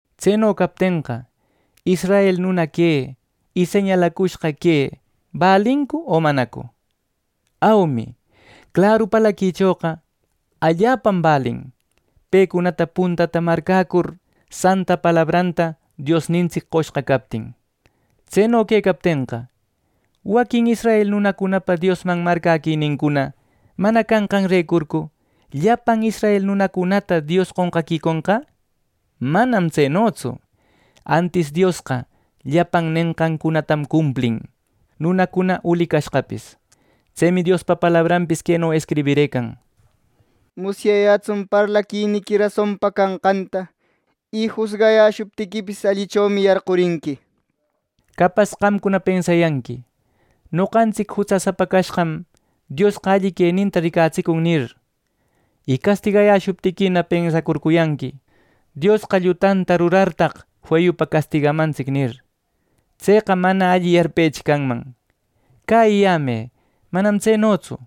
Tseno captenqa israel nuna que, y señalacushqa que ¿balincu, o manacu? ¡Aumi! Claru parlaquichoqa allapam balin, pecunata puntata marcäcur, Santa palabranta Diosnintsic qoshqa captin. Tseno quecaptenqa, ¿waquin israel nunacunapa Diosman marcäquinincuna mana canqanrecurcu, llapan israel nunacunata Dios qonqaquiconqa? ¡Manam tsenotsu! Antis Diosqa llapan nenqancunatam cumplin, nunacuna uli cashqapis. Tsemi Diospa palabranpis queno escribirëcan: “Musyayätsun parlaquiniqui rasonpa canqanta, Y jusgayäshuptiquipis allichomi yarqurinqui” nir. Capas qamcuna pensayanqui “Noqantsic jutsasapa cashqam, Diosqa alli queninta ricatsicun” nir. Y castigayäshuptiquina, pensacurcuyanqui, “Diosqa llutanta rurartaq feyupa castigamantsic” nir. (¡Tseqa mana alli yarpechi canman!) Cäyiyämë: ¡Manam tsenotsu!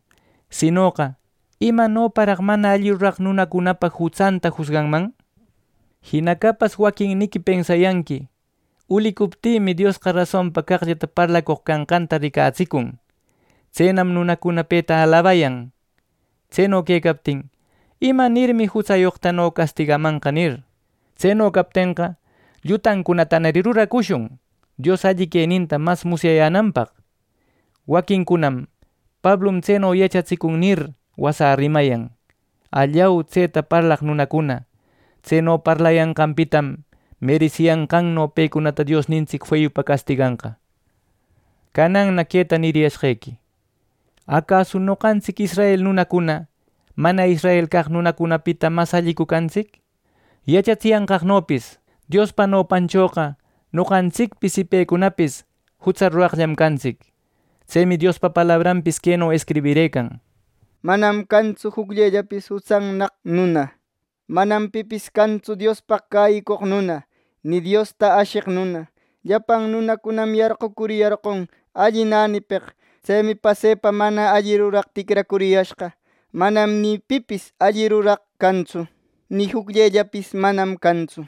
Sinoqa, ¿imanoraq mana alli ruraq nunacunapa jutsanta jusganman! Jina capas waquinniqui pensayanqui “Ulicuptïmi, Diosqa rasonpa caqllata parlacoq canqanta ricatsicun; tsenam nunacuna peta alabayan. Tseno quecaptin, ¿imanirmi jutsayoqtano castigamanqa!” nir. ¡Tseno captenqa, llutancunatanari ruracushun Dios alli queninta mas musyayänanpaq! Waquincunam “Pablum tseno yachatsicun” nir wasä rimecayan. ¡Allau, tseta parlaq nunacuna! Tseno parlayanqanpitam meresiyanqanno pecunata Diosnintsic feyupa castiganqa. Cananna queta niriyashqequi: ¿Acasu noqantsic israel nunacuna, mana israel caq nunacunapita mas allicu cantsic! Yachatsiyanqaqnopis Diospa nopanchoqa noqantsicpis y pecunapis jutsa ruraqllam cantsic. Tsemi Diospa palabranpis queno escribirëcan: “Manam cantsu jucllellapis jutsannaq nuna. Manam pipis cantsu Diospaq cäyicoq nuna, ni Diosta asheq nuna. Llapan nunacunam yarqacuriyarqon alli nänipeq. Tsemi pasepa mana alli ruraq ticracuriyashqa. Manam ni pipis alli ruraq cantsu, ¡Nï jucllellapis, manam cantsu!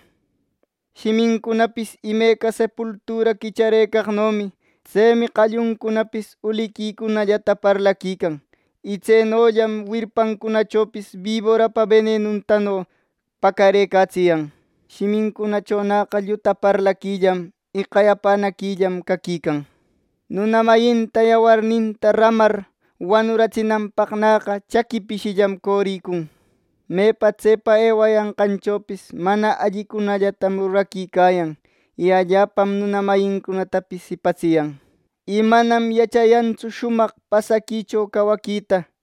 Shimincunapis imeca sepultura quicharëcaqnomi. Tsemi qalluncunapis uliquicunallata parlaquican, y tsenollam wirpancunachopis, biborapa benenuntano pacarëcatsiyan. Shimincunachonäqa lluta parlaquillam, y qayapänaquillam caquican. Nuna mayinta yawarninta ramar wanuratsinanpaqnäqa, chaqui pishillam coricun. Mepa, tsepa ewayanqanchopis mana allicunallatam ruraquicayan. Y allapam nuna mayincunatapis jipatsiyan. Y manam yachayantsu shumaq pasaquicho cawaquita.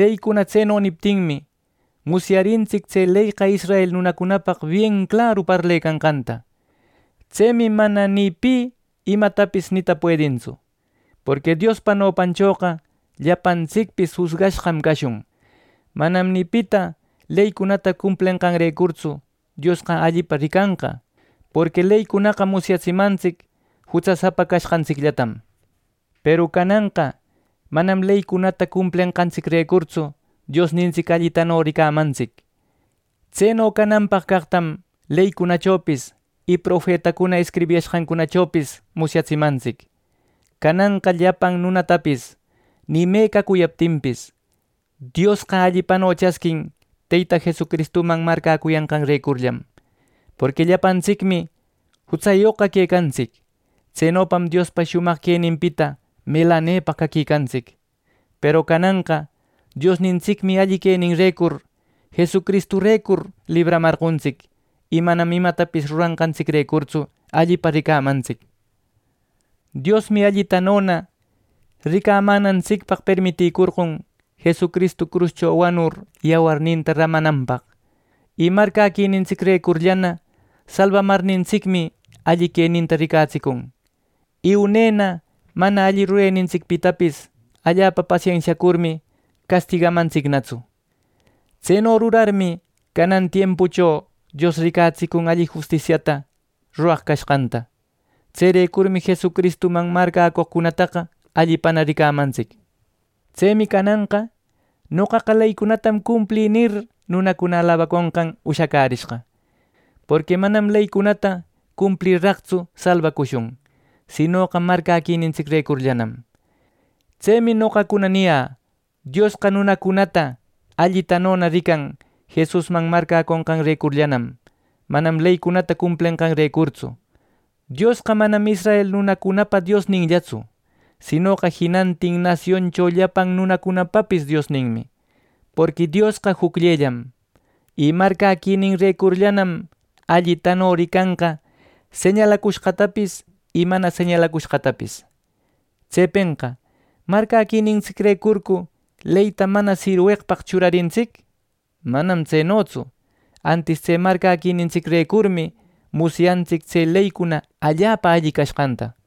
Leycuna tseno niptinmi, musyarintsic tse leyqa israel nunacunapaq bien claru parlecanqanta. Tsemi mana ni pi imatapis nita puedintsu. Porqui Diospa nopanchoqa llapantsicpis jusgashqam cashun. Manam ni pita leycunata cumplenqanrecurtsu Diosqa allipa ricanqa. Porqui leycunaqa musyatsimantsic jutsasapa canqantsicllatam. Peru cananqa manam leycunata cumplenqantsicrecurtsu Diosnintsic allitano ricamantsic. Tseno cananpaq caqtam leycunachopis y profetacuna escribiyashqanchopis musyatsimantsic. Cananqa llapan nunatapis pi me cacuyaptinpis, Diosqa allitano chasquin Teyta Jesucristuman marcäcuyanqanrecurllanam. Porqui llapantsicmi jutsayoqqa quecantsic. Tsenopam Diospa shumaq queninpita melanepaq caquicantsic. Peru cananqa Diosnintsicmi alli queninrecur, Jesucristurecurlla libraramarqontsic y manam imatapis ruranqantsicrecurtsu allipa ricamantsic. Diosmi allitanona ricamänantsicpaq permiterqon Jesucristu cruscho wanur yawarninta ramananpaq. Y marcäquinintsicrecurllana, salbamarnintsicmi alli queninta ricatsicun, y unena mana alli rurenintsicpitapis allapa pasensiacurmi castigamantsicnatsu. Tseno rurarninmi, canan tiempucho Dios ricatsicun alli justisia ruraq cashqanta. Tserecurmi Jesucristuman marcäcoqcunata allipana ricamantsic. Tsemi cananqa “Noqaqa leycunatam cumplï” nir, nunacuna alabaconqan ushacärishqa. Porqui manam leycunata cumplirraqtsu salbacushun; sinoqa marcäquinintsicrecurllam. Tsemi noqacuna niyä: Diosqa nunacunata allitanona rican Jesusman marcäconqarecurllanam, manam leycunata cumplenqanrecurtsu. Diosqa manam israel nunacunapa Diosninllatsu; sinoqa jinantin nasioncho llapan nunacunapapis Diosninmi. Porqui Diosqa jucllellam, y marcäquininrecurllanam allitano ricanqa señalacushqatapis y mana señalacushqatapis. Tsepenqa ¿marcäquinintsicrecurcu leyta mana sirweqpaq churarintsic? Manam tsenotsu. Antis tse marcäquinintsicrecurmi musyantsic tse leycuna allapa alli canqanta.